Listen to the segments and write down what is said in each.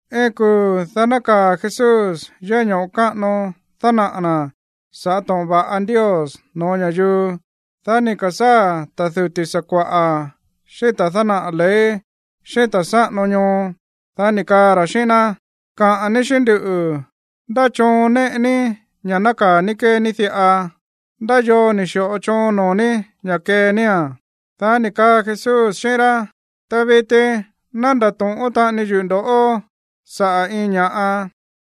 Iin kuu̱, dá nákaa̱ Jesús yéꞌé ño̱ꞌo káꞌano dánaꞌa̱ na̱ sa̱ꞌá to̱ꞌon va̱ꞌa Ndios no̱ó ña̱yuu. Dá ni̱ ka̱sáa̱ ta̱ duti̱ sakua̱ꞌa̱ xíꞌín ta̱ dánaꞌa̱ ley xíꞌín ta̱ sáꞌano ñoo, dá ni̱ kaa ra̱ xíꞌín ná: ―Kaꞌa̱n ní xíꞌín nduꞌu̱, ¿ndá choon néꞌe ní ña̱ nákaa̱ ní kée ní diꞌa? ¿Ndá yoo ni̱ xi̱ꞌo choon noo̱ ní ña̱ kee nía̱n? Dá ni̱ kaa Jesús xíꞌín rá: ―Ta viti ná ndato̱ꞌón taꞌani yuꞌu̱ ndo̱ꞌó saꞌa̱ iin ña̱ꞌa,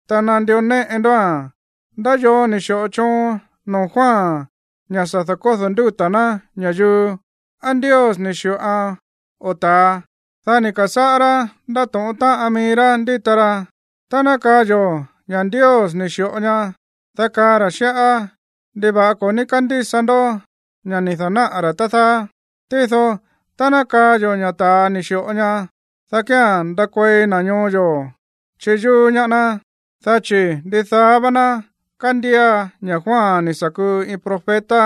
ta nandió néꞌe ndóa̱n. ¿Ndá yoo ni̱ xi̱ꞌo choon noo̱ Juan ña̱ sa̱ da̱kódo̱ ndúta̱ ná ña̱yuu? ¿Á Ndios ni̱ xi̱ꞌoan o ta̱a? Dá ni̱ ka̱sáꞌá rá ndátóꞌón táꞌan mií rá ndíta ra: ―Tá ná kaa yo̱ ña̱ Ndios ni̱ xi̱ꞌo ñaá, dá kaa ra̱ xíꞌá: “¿Ndiva̱ꞌa ko̱ ní kándísa ndó ña̱ ni̱ da̱náꞌa̱ ra̱, tá dáá?” Tído tá ná kaa yo̱ ña̱ ta̱a ni̱ xi̱ꞌo ñaá, dá kía̱n ndakuei na̱ ñoo yo̱ chiyúú ñaá ná, dá chi̱ ndidaá vá ná kándía ña̱ Juan ni̱ sa̱ kuu iin profeta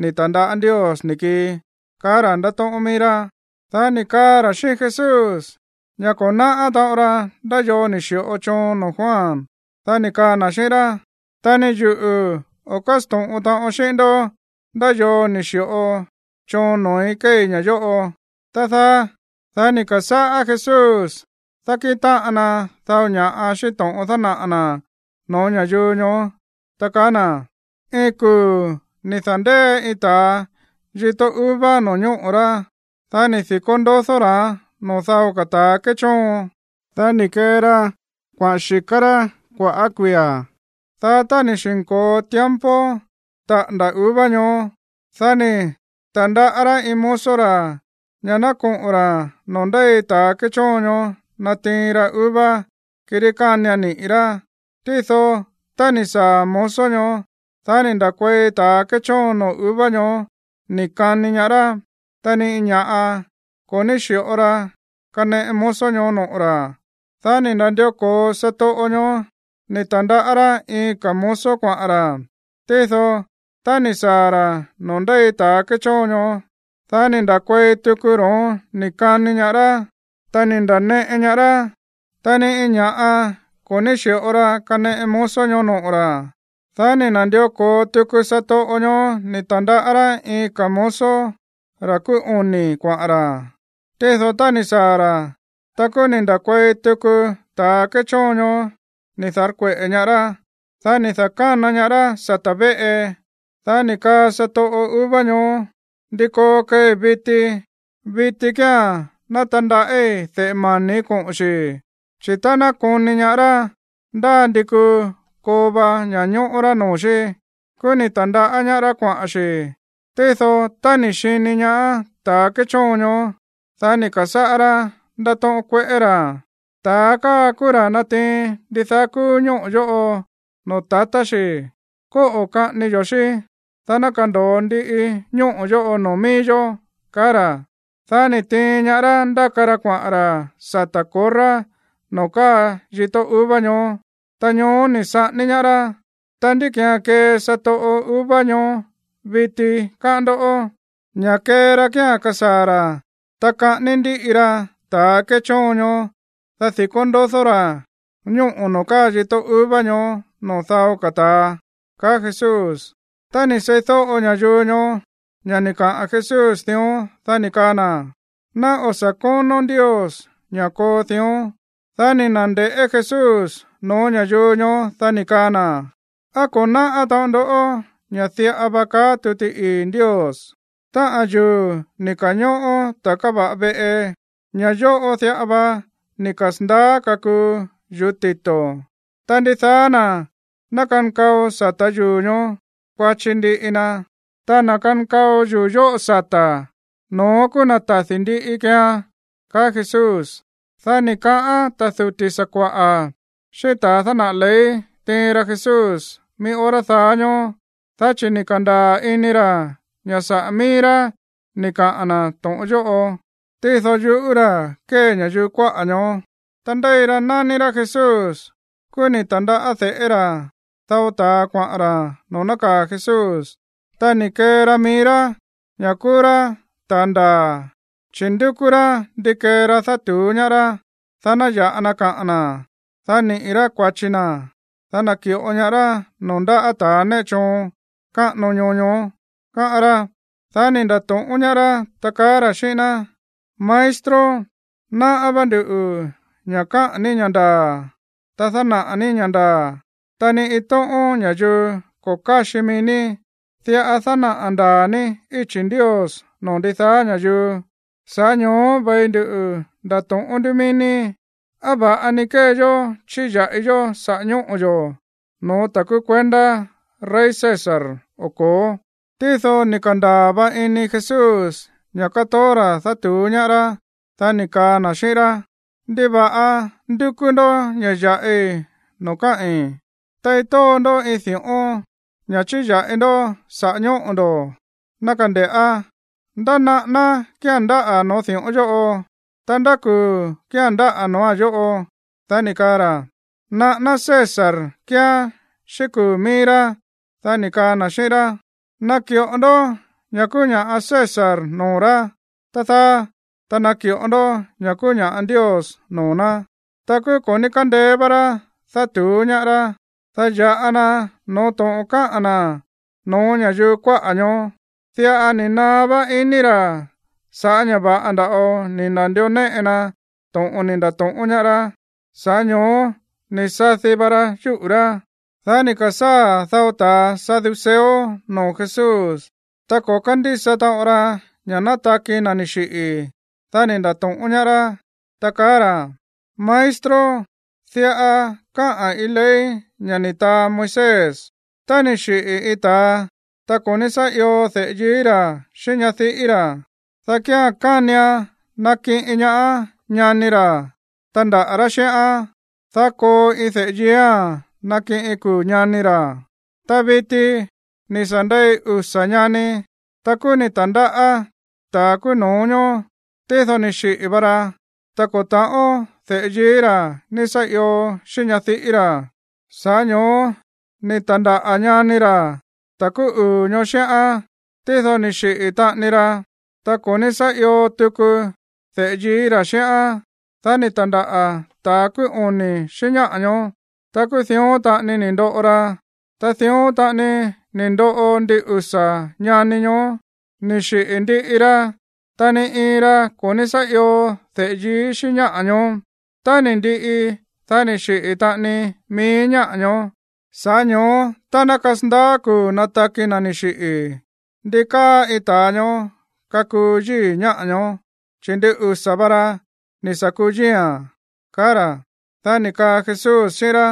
ni̱ ta̱ndaꞌá Ndios ni̱ kii ―kaá ra̱ ndátóꞌón mií rá. Dá ni̱ kaa ra̱ xíꞌín Jesús ña̱ ko̱ náꞌá taꞌon ra ndá yoo ni̱ xi̱ꞌo choon noo̱ Juan. Dá ni̱ kaa na̱ xíꞌín rá: ―Ta ni yuꞌu̱ o̱ kásto̱ꞌon taꞌon xíꞌín ndó ndá yoo ni̱ xi̱ꞌo choon noo̱í kéei ña̱ yóꞌo, tá dáá. Dá ni̱ ka̱sáꞌá Jesús dákíꞌin táꞌan na dao ña̱ꞌa xíꞌín to̱ꞌon dánaꞌa̱ na̱ no̱ó ña̱yuu ñoó, ta kaá na̱: ―Iin kuu̱ ni̱ da̱ndée iin ta̱a yitó uva no̱ñóꞌo̱ rá. Dá ni̱ di̱kó ndodó ra̱án noo̱ dao ka̱ ta̱a kéchóon. Dá ni̱ kee ra kuaꞌa̱n xi̱ká rá kua̱ꞌá kuia̱. Dá tá ni̱ xi̱nko̱o tiempo taꞌa̱nda̱ uva ñoó, dá ni̱ ta̱ndaꞌá rá iin mozo ra̱ ña̱ ná koꞌo̱n ra̱ noo̱ ndéi ta̱ kéchóon ñoó natiin ra uva, kirí kánian niꞌi̱ rá. Tído tá ni̱ saa̱ mozo ñoó, dá ni̱ nda̱kuei ta̱ kéchóon noo̱ uva ñoó ni̱ kani ñaá rá. Ta ni iin ña̱ꞌa ko̱ ní xi̱ꞌo ra kaneꞌe mozo ñoó noꞌo̱ ra̱. Dá ni̱ na̱ndió ko̱o satoꞌo ñoó ni̱ ta̱ndaꞌá rá iin ka̱ mozo kuaꞌa̱n ra̱. Tído tá ni̱ saa̱ ra̱ noo̱ ndéi ta̱ kéchóon ñoó, dá ni̱ nda̱kuei tuku ro̱ón ni̱ kani ñaá rá, ta ni̱ nda̱neꞌe ñaá rá. Ta ni iin ña̱ꞌa ko̱ ní xi̱ꞌo ra kaneꞌe mozo ñoó noꞌo̱ ra̱. Dá ni̱ na̱ndió ko̱o tuku satoꞌo ñoó ni̱ ta̱ndaꞌá rá iin ka̱ mozo, ra̱ kúú oni̱, kuaꞌa̱n ra̱. Tído tá ni̱ saa̱ ra̱, ta kúú ni̱ nda̱kuei tuku ta̱ kéchóon ñoó ni̱ da̱rkueꞌe̱ ñaá rá. Dá ni̱ da̱kána ñaá rá sata̱ véꞌe. Dá ni̱ kaa satoꞌo uva ñoó: “¿Ndi koo keei viti? Viti kía̱n ná tandaꞌí de̱ꞌe mani̱ koꞌo̱n xi̱. Chi̱ tá ná koni ñaá rá, ndá ndi kuu koo va ña̱ñóꞌó rá noo̱ xí.” Kúú ni̱ ta̱ndaꞌá ñaá rá kuaꞌa̱n xi̱. Tído, tá ni̱ xini ñaá ta̱a kéchóon ñoó, dá ni̱ ka̱sáꞌá rá ndátóꞌón kueꞌé ra̱: “Ta̱a káa kúú ra̱ natiin ndidaá kúú ñóꞌo̱ yóꞌo noo̱ tatá xi̱. Kóꞌo̱ kaꞌání yo̱ xí, dá ná kando̱o ndiꞌi ñóꞌo̱ yóꞌo noo̱ mií yó”, kaá ra̱. Dá ni̱ tiin ñaá rá ndáka ra kuaꞌa̱n ra̱ sata̱ korrá noo̱ káa yitó uva ñoó. Ta ñoó ni̱ saꞌání ñaá rá. Ta, ¿ndí ki̱án kee satoꞌo uva ñoó viti, káꞌán ndó? Ña̱ kee ra kía̱n kasaa̱ ra̱, ta kaꞌání ndíꞌi ra ta̱ kéchóon ñoó, dá di̱kó ndodó ra̱ ñóꞌo̱ noo̱ káa yitó uva ñoó noo̱ dao ka̱ ta̱a ―kaá Jesús. Tá ni̱ seídóꞌo ña̱yuu ñoó ña̱ ni̱ kaꞌa̱n Jesús dión, dá ni̱ kaa na̱: ―¡Ná o̱ sa̱ kónó Ndios ña̱ koo dión! Dá ni̱ na̱nde̱ꞌé Jesús no̱ó ña̱yuu ñoó, dá ni̱ kaa na̱: ―¿Á ko̱ náꞌá taꞌon ndó ña̱ diꞌa va kaá tuti ii̱ Ndios?: Táꞌa̱n yuu̱ ni̱ ka̱ñóꞌó ta̱a káva̱ꞌa veꞌe, ña̱ yóꞌo diꞌa va ni̱ kasa̱ndaá kakuu yuu̱ tito̱. Ta ndidaá na̱ ná kankao sa̱tá yuu̱ ñoó, kuachi ndiꞌi na. Ta na̱ kankao yuu̱ yóꞌo sata̱, no̱ón kúú na̱ tadi̱ ndiꞌi keean ―kaá Jesús. Dá ni̱ kaꞌán ta̱ duti̱ sakua̱ꞌa̱ xíꞌín ta̱ dánaꞌa̱ ley tiin ra Jesús mií hora daá ñóó, dá chi̱ ni̱ ka̱ndaa̱ ini ra̱ ña̱ saꞌa̱ mií rá ni̱ kaꞌa̱n na̱ to̱ꞌon yóꞌo. Tído yuꞌú ra̱ kée ña̱yuu kuáꞌa̱ ñoó. Ta ndéi ra nání rá Jesús. Kúú ni̱ ta̱ndaꞌá de̱ꞌé ra̱ dao ta̱a kuaꞌa̱n ra̱ noo̱ nákaa̱ Jesús. Ta ni̱ kee ra mií rá ña̱ kúú rá ta̱ ndaa̱, chi̱ ndúkú rá ndi kee ra dátu̱ú ñaá rá, dá ná ya̱ꞌa na kaꞌa̱n na̱, dá niꞌi̱ rá kua̱chi na̱, dá naki̱ꞌo ñaá rá noo̱ ndáꞌa̱ ta̱ néꞌe choon káꞌano ñoo ñoó, káꞌán rá. Dá ni̱ nda̱to̱ꞌón ñaá rá, ta kaá ra̱ xíꞌín ná: ―Maestro, náꞌá vá nduꞌu̱ ña̱ káꞌa̱n ní ña̱ ndaa̱, ta dánaꞌa̱ ní ña̱ ndaa̱. Ta ni iin tóꞌón ña̱yuu ko̱ káxi mií ní. Diꞌa dánaꞌa̱ ndaa̱ ní íchi̱ Ndios noo̱ ndidaá ña̱yuu. Sa̱ꞌá ño̱ó ve̱i ndu ndato̱ꞌón nduꞌu̱ mií ní, ¿á va̱ꞌa ni kée yó chíya̱ꞌi yó saꞌa̱ ñóꞌo̱ yo̱ no̱ó ta̱ kúú kuendá rey César o ko̱ó? Tído ni̱ ka̱ndaa̱ va ini Jesús ña̱ katoó ra̱ dátu̱ú ñaá rá. Dá ni̱ kaa na̱ xíꞌín rá: ―¿Ndiva̱ꞌa ndúkú ndó ña̱ ya̱ꞌi noo̱ káꞌi̱n? Tei tóo ndó iin di̱ꞌón, ña̱ chíya̱ꞌi ndó saꞌa̱ ñóꞌo̱ ndo̱, ná kande̱ꞌá. ¿Ndá naꞌáná kía̱n ndáꞌa̱ noo̱ di̱ꞌón yóꞌo? Ta, ¿ndá kuu̱ kía̱n ndáꞌa̱ no̱óa̱n yóꞌo? Dá ni̱ kaa ra̱: ―Naꞌáná César kíán xíꞌín kuu̱ mií rá. Dá ni̱ kaa na̱ xíꞌín rá: ―Naki̱ꞌo ndó ña̱ kúú ña̱ꞌa César noo̱ rá, tá dáá, ta naki̱ꞌo ndó ña̱ kúú ña̱ꞌa Ndios noo̱ ná. Ta kúú ko̱ ní kándeé vá rá dátu̱ú ñaá rá, dá ya̱ꞌa na no̱ó to̱ꞌon káꞌa̱n na̱ no̱ó ña̱yuu kuáꞌa̱ ñoó. Diꞌa ni̱ naá vá iní ra̱ sa̱ꞌá ña̱ va̱ꞌa nda̱ꞌo ni̱ na̱ndió néꞌe na to̱ꞌon ni̱ nda̱to̱ꞌón ñaá rá. Sa̱ꞌá ño̱ó ni̱ sadi va ra yúꞌu̱ rá. Dá ni̱ ka̱sáa̱ dao ta̱ saduceo noo̱ Jesús. Ta ko̱ kándísa taꞌon ra ña̱ nátaki na̱ ni̱ xiꞌi̱. Dá ni̱ nda̱to̱ꞌón ñaá rá, ta kaá ra̱: ―Maestro, diꞌa káꞌa̱n iin ley ña̱ ni̱ taa Moisés: Tá ni̱ xiꞌi̱ iin ta̱a, ta ko̱ ní sá io de̱ꞌe yií ra̱ xíꞌín ñadiꞌí ra̱, dá kía̱n kánian nakiꞌin ñaá ñani ra̱ tandaꞌa̱ rá xíꞌán, dá koo iin de̱ꞌe yiía̱n nakiꞌin kuu̱ ñani ra̱. Ta viti, ni̱ sa̱ ndei usa̱ ñani. Ta kúú ni̱ ta̱ndáꞌa̱ ta̱ kúú no̱ó ñoó. Tído ni̱ xiꞌi̱ va ra, ta ko̱ ta̱ꞌón de̱ꞌe yií ra̱ ní sá io xíꞌín ñadiꞌí ra̱. Sa̱ꞌá ño̱ó ni̱ ta̱ndáꞌa̱ ñani ra̱, ta̱ kúú uu̱ ñoó, xíꞌán. Tído ni̱ xiꞌi̱ taꞌani ra, ta ko̱ ní sá io tuku de̱ꞌe yií ra̱ xíꞌán. Dá ni̱ ta̱ndáꞌa̱ ta̱ kúú oni̱ xíꞌín ñáꞌa̱ ñoó. Ta kúú dión taꞌani ni̱ ndoꞌo ra. Ta dión taꞌani ni̱ ndoꞌo ndin usa̱ ñani ñoó, ni̱ xiꞌi̱ ndiꞌi ra, ta ni iin ra ko̱ ní sá io de̱ꞌe yií xíꞌín ñáꞌa̱ ñoó. Tá ni̱ ndiꞌi, dá ni̱ xiꞌi̱ taꞌani mií ñáꞌa̱ ñoó. Sa̱ꞌá ño̱ó, tá ná kasandaá kuu̱ nataki na̱ ni̱ xiꞌi̱, ¿ndi káa iin ta̱a ñoó kakuu yíi̱ ñáꞌa̱ ñoó, chi̱ ndin usa̱ va ra ni̱ sa̱ kuu yíi̱a̱n? ―kaá ra̱. Dá ni̱ kaa Jesús xíꞌín rá: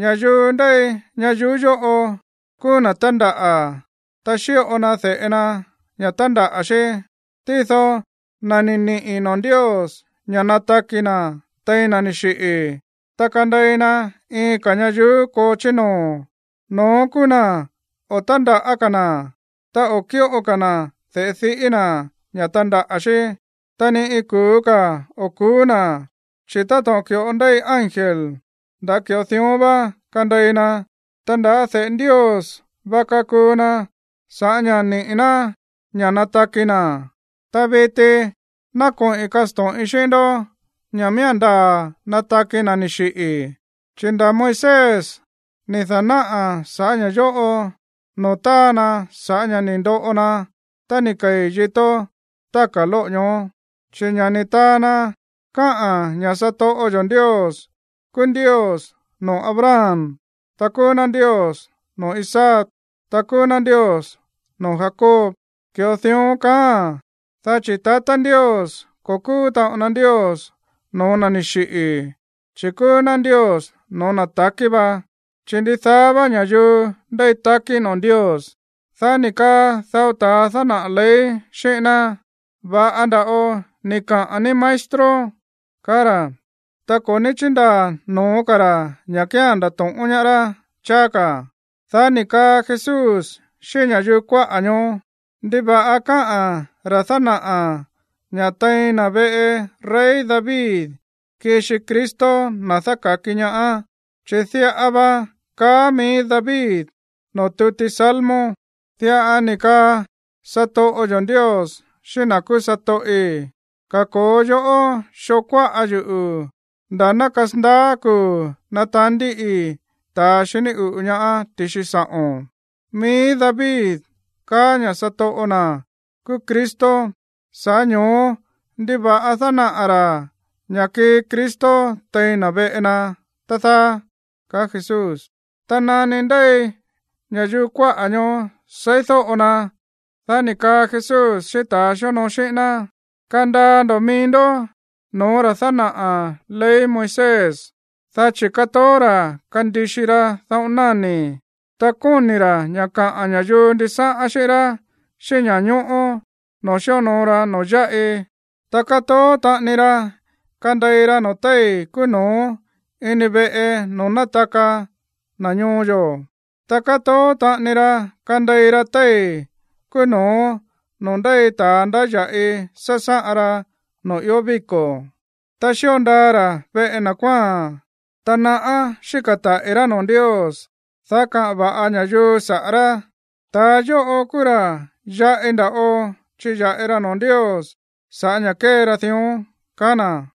―Ña̱yuu ndéi ñayuú yóꞌo kúú na̱ tándaꞌa̱, ta xíꞌo na de̱ꞌe na ña̱ tandaꞌa̱ xí. Tído na̱ ni̱ niꞌi̱ noo̱ Ndios ña̱ nataki na̱ tein na̱ ni̱ xiꞌi̱, ta kandei na iin ka̱ ñayuú koo chí noo̱, no̱ón kúú na̱ o̱ tándaꞌa̱ ka̱ na̱, ta o̱ kíꞌo ka̱ na̱ de̱ꞌe diꞌí na̱ ña̱ tandaꞌa̱ xí. Ta ni iin kuu̱ ka̱ o̱ ku̱ú na̱, chi̱ táto̱ꞌon ki̱ꞌo ndéi ángel, nda̱ ki̱ꞌo dión vá kandei na, ta nda̱ de̱ꞌe Ndios vá kakuu na sa̱ꞌá ña̱ niꞌi̱ ná ña̱ nataki na̱. Ta viti ná koꞌi̱n kasto̱ꞌin xíꞌín ndó ña̱ miía̱n ndaa̱ nataki na̱ ni̱ xiꞌi̱, chi̱ nda̱ Moisés ni̱ da̱náꞌa̱ sa̱ꞌá ña̱ yóꞌo noo̱ táa na sa̱ꞌá ña̱ ni̱ ndoꞌo na tá ni̱ kei̱ yitó táka̱ lóꞌo̱ ñoó. Chi̱ ña̱ ni̱ taa na káꞌa̱n ña̱ satoꞌo yo̱ Ndios kúú Ndios noo̱ Abraham, ta kúú ná Ndios noo̱ Isaac, ta kúú ná Ndios noo̱ Jacob. Ki̱ꞌo dión kaáa̱n, dá chi̱ tatá Ndios, ko̱ kúú taꞌon na Ndios no̱ó na̱ ni̱ xiꞌi̱, chi̱ kúú ná Ndios no̱ó na̱ takí va, chi̱ ndidaá vá ña̱yuu ndéi takí noo̱ Ndios. Dá ni̱ kaa dao ta̱ dánaꞌa̱ ley xíꞌín ná: ―Va̱ꞌa nda̱ꞌo ni̱ kaꞌa̱n ní, maestro ―kaá ra̱. Ta ko̱ ní chíndaa̱ no̱ó ka̱ ra̱ ña̱ kía̱n ndato̱ꞌón ñaá rá cháá ka̱. Dá ni̱ kaa Jesús xíꞌín ña̱yuu kuáꞌa̱ ñoó: ―¿Ndiva̱ꞌa káꞌa̱n ra̱ dánaꞌa̱ ña̱ tein na̱ veꞌe rey David kixi Cristo, na̱ dáka̱ki ñaá? Chi̱ diꞌa va kaá mií vá David noo̱ tuti Salmo: Diꞌa ni̱ kaa satoꞌo yo̱ Ndios xíꞌín na̱ kúú satoꞌi̱: “Kako̱o yoꞌó xoo kuáꞌa yuꞌu̱, nda̱ ná kasandaá kuu̱ nataán ndíꞌii ta̱ xiní uꞌu̱ ñaá ti̱xi sa̱ꞌo̱n.” Mií David kaá ña̱ satoꞌo na̱ kúú Cristo, sa̱ꞌá ño̱ó, ¿ndiva̱ꞌa dánaꞌa̱ ra̱ ña̱ kii Cristo tein na̱ veꞌe na, tá dáá? ―kaá Jesús. Ta nani ndéi ña̱yuu kuáꞌa̱ ñoó seídóꞌo na, dá ni̱ kaa Jesús xíꞌín ta̱a xíonoo xíꞌín ná: ―Kandaa ndo̱ mií ndó no̱ó ra̱ dánaꞌa̱ ley Moisés, dá chi̱ kátoó ra̱ kandixi ra dáꞌo̱n náni̱, ta kóni̱ ra̱ ña̱ kaꞌa̱n ña̱yuu ndisáꞌán xíꞌín rá xíꞌín ña̱ñóꞌó noo̱ xíonoo ra noo̱ yáꞌi. Ta kátoó taꞌani ra kandei ra noo̱ téi̱ kúú no̱ó ini veꞌe noo̱ nátaka na̱ ñoo yo̱, ta kátoó taꞌani ra kandei ra téi̱ kúú no̱ó noo̱ ndéi ta̱ ndáya̱ꞌi sásáꞌan ra noo̱ ió víko̱. Ta xío ndaa ra̱ veꞌe na̱ kuáa̱n. Ta naꞌá xíka̱ taꞌi̱ rá noo̱ Ndios, dá kaꞌa̱n va̱ꞌa ña̱yuu saꞌa̱ rá. Ta̱ yóꞌo kúú ra̱ yaꞌi nda̱ꞌo chiya̱ꞌi ra noo̱ Ndios sa̱ꞌá ña̱ kée ra dión ―kaá na̱.